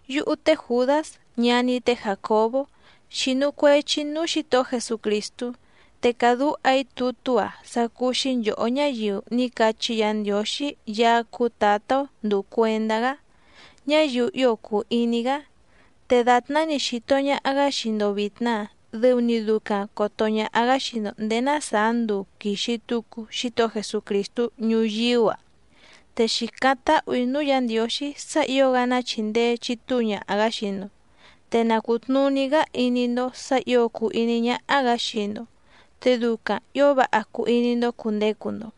Yúhú té Jùdás ñaní té Jàcobó xínú cuèchi‑í núú Xǐtohó Jesucrìstú, te càdúha‑í tutú‑a sá cúú‑xí nchòhó ñáyiu ní cachí Yǎ Ndiǒxí Yaá cúú Tǎtá‑ó ndùu cuendá‑gá, ñáyiu ío cùu iní‑gá. Te dàtná‑ni xìto ñaha‑gá xii‑ndo vìtna dɨu‑ni ducaⁿ còto ñaha‑gá xii‑ndo ndèé ná sàá nduu quìxi tucu Xítohó Jesucrìstú ñuyíú‑a. Te xìcáⁿ táhù‑í núú Yǎ Ndiǒxí sá ǐo‑gá ná chìndee chitúu ñaha‑gǎ xii‑ndo, te na cùtnuní‑gá iní‑ndó sǎ ǐo cùu iní ñáhá‑gǎ xii‑ndo, te ducaⁿ ǐo váha cuu iní‑ndó cùndecu‑ndo.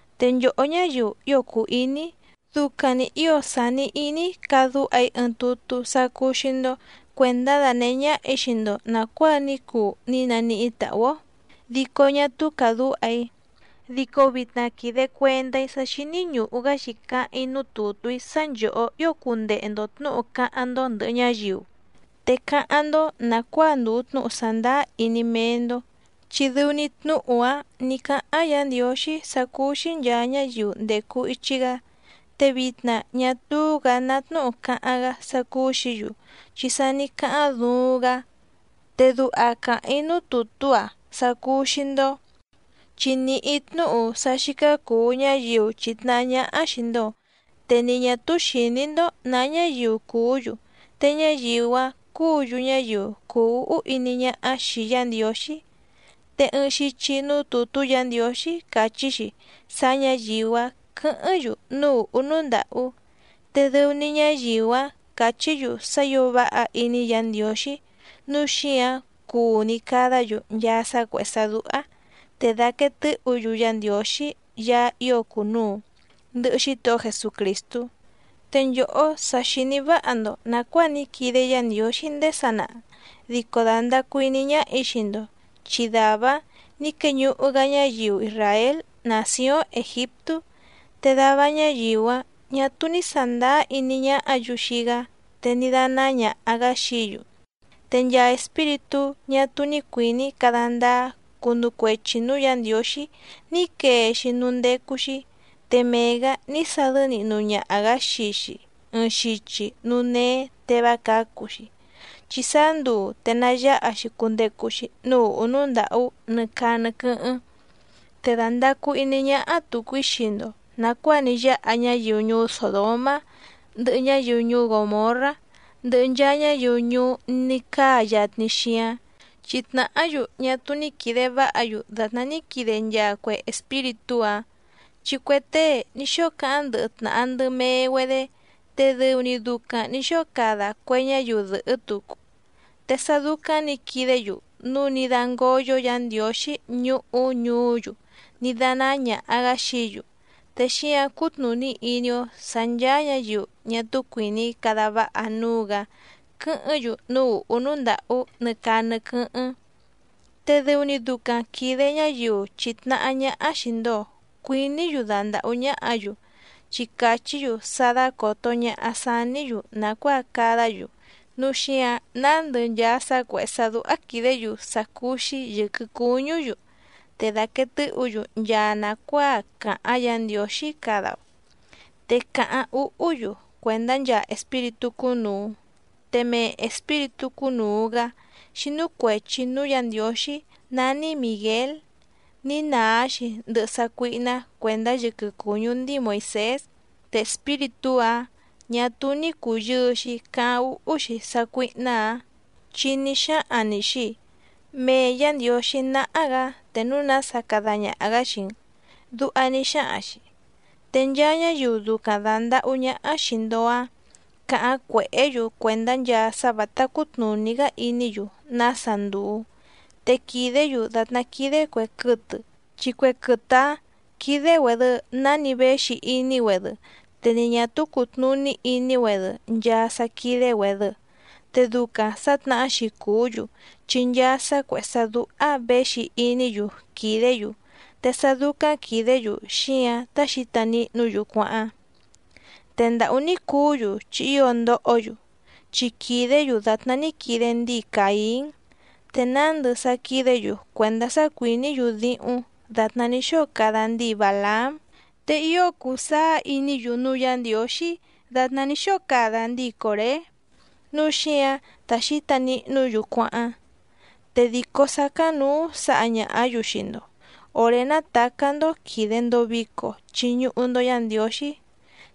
Te nchòhó ñáyiu ío cùu iní‑í, ducaⁿ‑ni ǐo sàni iní‑í cadúha‑í ɨɨⁿ tutú sá cúú‑xí‑ndó cuèndá danèhé ñáhà‑í xii‑ndo nàcuáa ní cuu ní naníhí tàhú‑ó dico ñá túú càdúha‑í, dico vitna quìde cuendá‑í sá xíní ñùhu‑gá‑xi cáháⁿ‑í núú tùtú‑í sá nchòhó ío cundehe‑ndo tnǔhu cáháⁿ‑ndó ndɨ̀hɨ ñáyiu, te cáháⁿ‑ndó nàcuáa ndùu tnúhu sàndáá iní méé‑ndó, chi dɨu‑ni tnúhu‑áⁿ nǐ cáháⁿ Yǎ Ndiǒxí sá cúú‑xí nchàa ñáyiu ndècu ichi‑gá. Te vitna ñá túú‑gǎ ná tnúhu càháⁿ‑gá sá cúú‑xǐ‑yu, chi sa ní cáháⁿ duuⁿ‑gá. Te duha càháⁿ‑í núú tùtú‑a sá cúú‑xí‑ndó, chi nìhí‑í tnúhu sá xícá cùu ñáyiu chìtnahá ñáhá xìi‑ndo, te ni ñà túú xìní‑ndó nǎ ñáyiu cùú‑yu, te ñáyiu‑áⁿ cúǔ‑yu ñáyiu cùu úhú iní ñáhá xìi Yá Ndiǒxí. Te ɨɨⁿ xichi núú tùtú Yǎ Ndiǒxí càchí‑xi sá ñǎyiu‑áⁿ quɨ̌hɨ́ⁿ‑yu núú ùhú núú ndàhú, te dɨu‑ni ñáyiu‑áⁿ càchí‑yu sá ǐo váha iní Yǎ Ndiǒxí nǔu xíǎⁿ cuu‑ni cadá‑yu nchaa sá cuèhé sá dúhá. Te dàquee tɨ́hǔ‑yu Yá Ndiǒxí Yaá ío cùnuu, ndɨhɨ Xítohó Jesucrìstú. Te nchòhó sa xìní váha‑ndo nàcuáa ní quide Yá Ndiǒxí ndéé sanaha dico dàndacu iní ñáhà‑í xii‑ndo, chi dàvá‑áⁿ nǐ queñuhu‑gá ñáyiu isràél nàcióⁿ Ègiptú, te dava ñáyiu‑áⁿ ñà túú ní sàndáá iní ñáhǎ‑yu xii‑gá te ní dánáá ñàha‑gá xií‑yu. Te nchaa espíritú ñá túú ní cuìní cada ndáá cunu cuechi nǔú Yǎ Ndiǒxí ní quee‑xi núú ndécú‑xí, te mee‑gǎ ní sadɨ́ nihnu ñaha‑gǎ xii‑xi ɨɨⁿ xichi núú néé te vá cǎcu‑xi, chi sáá nduu te nayáha‑xi cundecu‑xi núú ùhú núú ndàhú nɨ caa nɨ quɨ́hɨ́ⁿ. Te dàndacu iní ñáhá tùcu‑í xii‑ndo nàcuáa ní yáha ñáyiu ñuú Sòdomá, ndɨhɨ ñáyiu ñuú Gòmorrá, ndɨhɨ nchaa ñáyiu ñuú ní cáa yatni xíáⁿ, chi tnàhá‑yu ñá túú ní quìde váha‑yu dàtná ní quide nchaa cue espíritú‑áⁿ. Chi cue tée ní xóo cáháⁿ ndɨhɨ tnàha ndɨ mee‑güedé, te dɨu‑ni ducaⁿ nǐ xóo cada cue ñáyiu dɨ̀hɨ́ tucu. Te sá dúcáⁿ nǐ quidé‑yu núu ní dángóyó Yǎ Ndiǒxí ñuhú ñuú‑yu ní dánáá ñàha‑gá xií‑yu. Te xíǎⁿ cútnùní iní‑ó sǎ nchàa ñáyiu ñá túú cuìní cada váha núú‑gǎ quɨ́hɨ́ⁿ‑yu núú ùhú núú ndàhú nɨ caa nɨ quɨ́hɨ́ⁿ. Te dɨu‑ni ducaⁿ quìde ñáyiu chìtnahá ñáhá xìi‑ndo cuiní‑yu dandàhú ñáhǎ‑yu, chi càchí‑yu sá dácòto ñaha saní‑yu nàcuáa cadá‑yu, núu xíǎⁿ nándɨ nchaa sá cuèhé sá dúhá quìdé‑yu sá cúú‑xí yɨ̀quɨ cuñú‑yu, te dàquee tɨ́hǔ‑yu nchaa nàcuáa càháⁿ Yǎ Ndiǒxí cada‑o, te càháⁿ úhú‑yu cuèndá nchaa espíritú cúnùu. Te mee espíritú cúnùu‑gá xínú cuèchi núú Yǎ Ndiǒxí nání Mìguél ní nàá‑xi ndɨhɨ sácuíhná cuèndá yɨquɨ cùñú ndíi Moìsés. Te espíritú‑áⁿ ñà túú ní cùyɨɨ‑xi cáháⁿ úhú‑xi sácuíhná‑ǎⁿ, chi ní xáhaⁿ‑ni‑xi: “Mee Yǎ Ndiǒxí náhá‑gǎ te núu nása cada ñaha‑gǎ xii‑n”, duha ní xáhaⁿ‑xi. Te nchaa ñáyiu ducaⁿ dàndahú ñáhá xìi‑ndo‑áⁿ càháⁿ cuèhé‑yu cuèndá nchaa sá vǎtá cútnùní‑gá iní‑yu nása ndùu, te quìdé‑yu dàtná quídé cuè quɨtɨ chi cue quɨtɨ‑áⁿ quídé‑güèdɨ náni véxi iní‑güedɨ, te ni ñà túú cùtnuní iní‑güedɨ nchaa sá quídé‑güèdɨ. Te ducaⁿ sà tnahá‑xi cùú‑yu, chi nchaa sá cuèhé sá dúhá věxi iní‑yu quìdé‑yu, te sá dúcáⁿ quìdé‑yu xíǎⁿ tá xǐta nihnú‑yu cuáháⁿ. ¡Te ndàhú ní cuú‑yu chi ío ndohó‑yu!, chi quìdé‑yu dàtná ní quide ndíi Càín. Te nándɨ sá quídě‑yu cuèndá sá cuìní‑yu díhúⁿ dàtná ní xóo cada ndíi Bàlaám. Te ío cùu sáá iní‑yu núú Yǎ Ndiǒxí dàtná ní xóo cada ndíi Còré, núu xíǎⁿ tá xǐta nihnú‑yu cuáháⁿ. Te dìcó sácáⁿnǔú sǎha ñàhá‑yu xii‑ndo òré nátàcá‑ndó quìde‑ndo vico chiñuhu‑ndo Yá Ndiǒxí.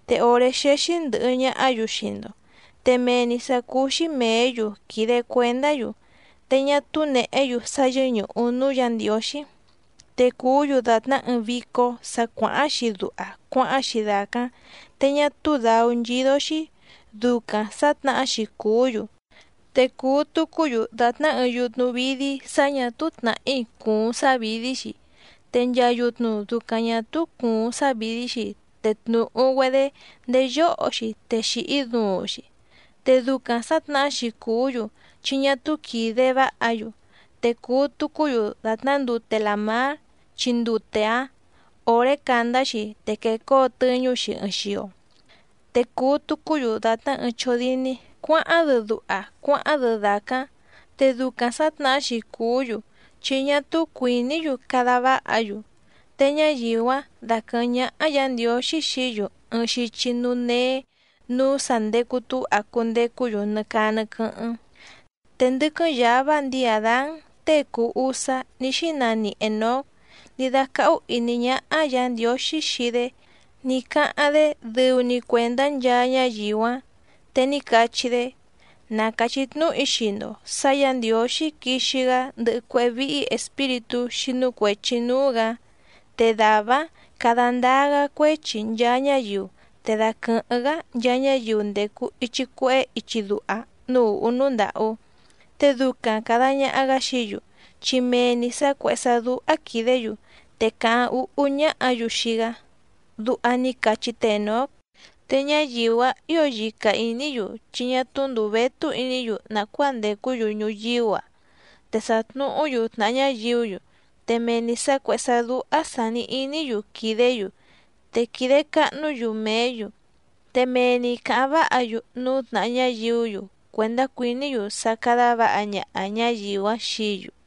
Te òré xéxí ndɨ̀hɨ ñahá‑yu xii‑ndo te mee‑ni sǎ cúú‑xí mèé‑yu quìde cuendá‑yu, te ñá túú nèhé‑yu sá yɨ́ñùhu núú Yǎ Ndiǒxí. Te cùú‑yu dàtná ɨɨⁿ vícó sǎ cuàháⁿ‑xi duha cuáháⁿ‑xi dàcáⁿ te ñá túú dǎú nchídó‑xí, ducaⁿ sà tnahá‑xi cùú‑yu. Te cùu tucú‑yu dàtná ɨɨⁿ yutnu vídí sá ñà túú tnàhí cùuⁿ sávìdí‑xi, te nchaa yutnu ducaⁿ ñà túú cùuⁿ sávìdí‑xi te tnùhu‑güedé ndéé yóho‑xi te xìhí duuⁿ‑xi. Te ducaⁿ sǎtnahá‑xi cùú‑yu, chi ñá túú quìde váha‑yu. Te cùu tucú‑yu dàtná ndute làmár, chi ndute‑áⁿ òré càndá‑xi te quecóo tɨ́ñú‑xi ɨɨⁿ xio. Te cùu tucú‑yu dàtná ɨɨⁿ chódíní cuǎháⁿ‑dɨ duha cuáháⁿ‑dɨ dàcáⁿ. Te ducaⁿ sǎtnàhá‑xi cùú‑yu, chi ñá túú cuìní‑yu cada váha‑yu. Te ñáyiu‑áⁿ daquɨ̀hɨ́ⁿ ñáhá Yǎ Ndiǒxí xií‑yu ɨɨⁿ xichi núú néé nǔú sà ndecu túha cundecú‑yu nɨ caa nɨ quɨ́hɨ́ⁿ. Te ndɨ́quɨ́ⁿ yǎvá ndíi Àdán tée cùu usá ní xínani Ènóc ní dácáhú ìní ñáhá Yǎ Ndiǒxí xii‑dé ní cáháⁿ‑dé dɨu‑ni cuèndá nchaa ñáyiu‑áⁿ. Te ní cachí‑dé: “Na càchí tnúhu‑í xii‑ndo sǎ Yǎ Ndiǒxí quixi‑gá ndɨhɨ cuéhé víhí espíritú xínú cuèchi núú‑gǎ. Te dàvá‑áⁿ cada ndáá‑gá cuéchi nchaa ñáyiu te daquɨ̀hɨ́ⁿ‑gá nchaa ñáyiu ndècu ichi cuehé ichi duha núú ùhú núú ndàhú, te ducaⁿ càda ñaha‑gá xií‑yu, chi mee‑ni sǎ cuèhé sá dúhá quìdé‑yu, te càháⁿ úhú ñáhǎ‑yu xii‑gá”, duha ní cachí te Ènóc. Te ñáyiu‑áⁿ ǐo yica ìní‑yu chi ñá túú ndùu vétú iní‑yu nàcuáa ndècú‑yu ñuyíú‑a, te sàtnuhú‑yu tnàha ñáyiú‑yu te mee‑ni sǎ cuèhé sá dúhá sàni iní‑yu quìdé‑yu, te quìde cahnú‑yu mèé‑yu, te mee‑ni càháⁿ váha‑yu núú tnàha ñáyiú‑yu cuèndá cuìní‑yu sá cádá vǎha ñaha ñǎyiu‑áⁿ xií‑yu.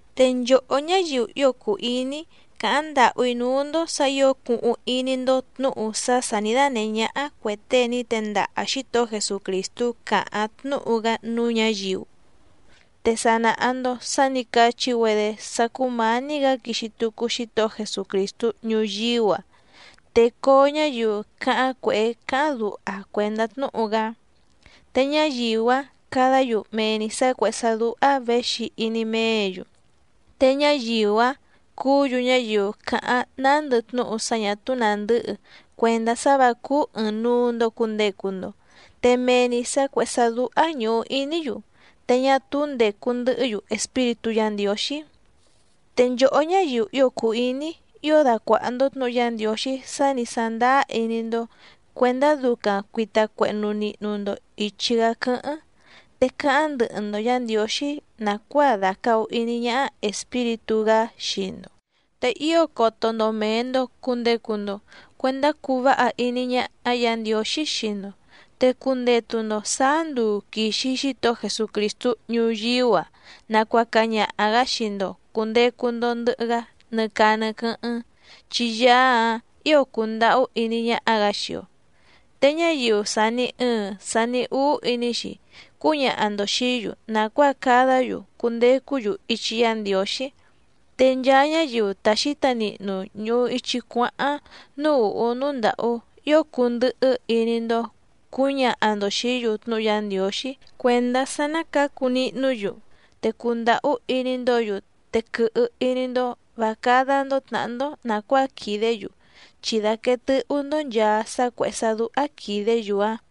Te nchòhó ñáyiu ío cùu iní‑í, càháⁿ ndàhú‑í núú‑ndó sǎ ǐo cuhuⁿ iní‑ndó tnǔhu sá sà ní dánèhé ñáhá cuè tée ní tendaha Xǐtohó Jesucrìstú càháⁿ tnúhu‑gá núú ñǎyiu. Te sa nàha‑ndo sá nǐ cachí‑güedé sá cùmání‑gǎ quixi tucu Xítohó Jesucrìstú ñuyíú‑a, te coo ñáyiu cáháⁿ cuèhé cáháⁿ duha cuèndá tnúhu‑gá. Te ñáyiu‑áⁿ cadá‑yu mee‑ni sǎ cuèhé sá dúhá věxi iní méě‑yu. Te ñáyiu‑áⁿ cúǔ‑yu ñáyiu càháⁿ nándɨ tnúhu sá ñà túú nàndɨ́hɨ cuèndá sá vǎ cúú ɨ̀ɨⁿnuu‑ndo cundecu‑ndo, te mee‑ni sǎ cuèhé sá dúhá ñùhu iní‑yu, te ñá túú ndècu ndɨhɨ́‑yu Espíritú Yǎ Ndiǒxí. Te nchòhó ñáyiu ío cùu iní‑í, ío dacuàha‑ndo tnúhu Yá Ndiǒxí sá nǐ sándáá iní‑ndó cuèndá ducaⁿ cuìta cuehnu nihnu‑ndo ichi‑gá quɨ́hɨ́ⁿ, te cáháⁿ ndɨhɨ‑ndo Yǎ Ndiǒxí nàcuáa dàcahu iní ñáhá Espíritú‑gá xii‑ndo. Te ío coto‑ndo mèe‑ndo cundecu‑ndo cuendá cuu váha iní ñáhá Yǎ Ndiǒxí xii‑ndo, te cundetu‑ndo sàá nduu quìxi Xítohó Jesucrìstú ñuyíú‑a nacuaca ñaha‑gǎ xii‑ndo cùndecu‑ndo ndɨhɨ‑gá nɨ caa nɨ quɨ́hɨ́ⁿ, chi Yaá‑áⁿ ǐo cùndahú iní ñáhá‑gǎ xii‑o. Te ñáyiu sàni ɨɨⁿ sani úú iní‑xi cúñaha‑ndo xìí‑yu nàcuáa cadá‑yu cundecú‑yu ichi Yá Ndiǒxí. Te nchaa ñáyiu ta xǐta nihnu ñùhu ichi cuáháⁿ núú ùhú núú ndàhú, ío cundɨhɨ́ iní‑ndó cǔñaha‑ndo xìí‑yu tnúhu Yá Ndiǒxí cuèndá sá ná cǎcu nihnú‑yu, te cundàhú iní‑ndǒ‑yu, te quɨhɨ iní‑ndó vǎ cádá‑ndó tnàhá‑ndó nàcuáa quìdé‑yu, chi daquèe tɨ́hú‑ndó nchàa sá cuèhé sá dúhá quìdé‑yu‑áⁿ.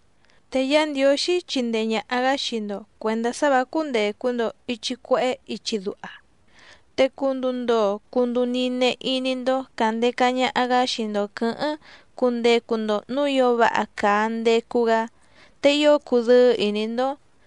Te Yá Ndiǒxí chindee ñàha‑gá xii‑ndo cuèndá sá vǎ cúndècu‑ndo ichi cuehé ichi duha, te cunduu ndoo cunduu nine iní‑ndó càndeca ñaha‑gá xii‑ndo quɨ̌hɨ́ⁿ cundecu‑ndo nǔú ǐo váha càa ndecu‑gá, te ío cudɨ́ɨ́ ìní‑ndó.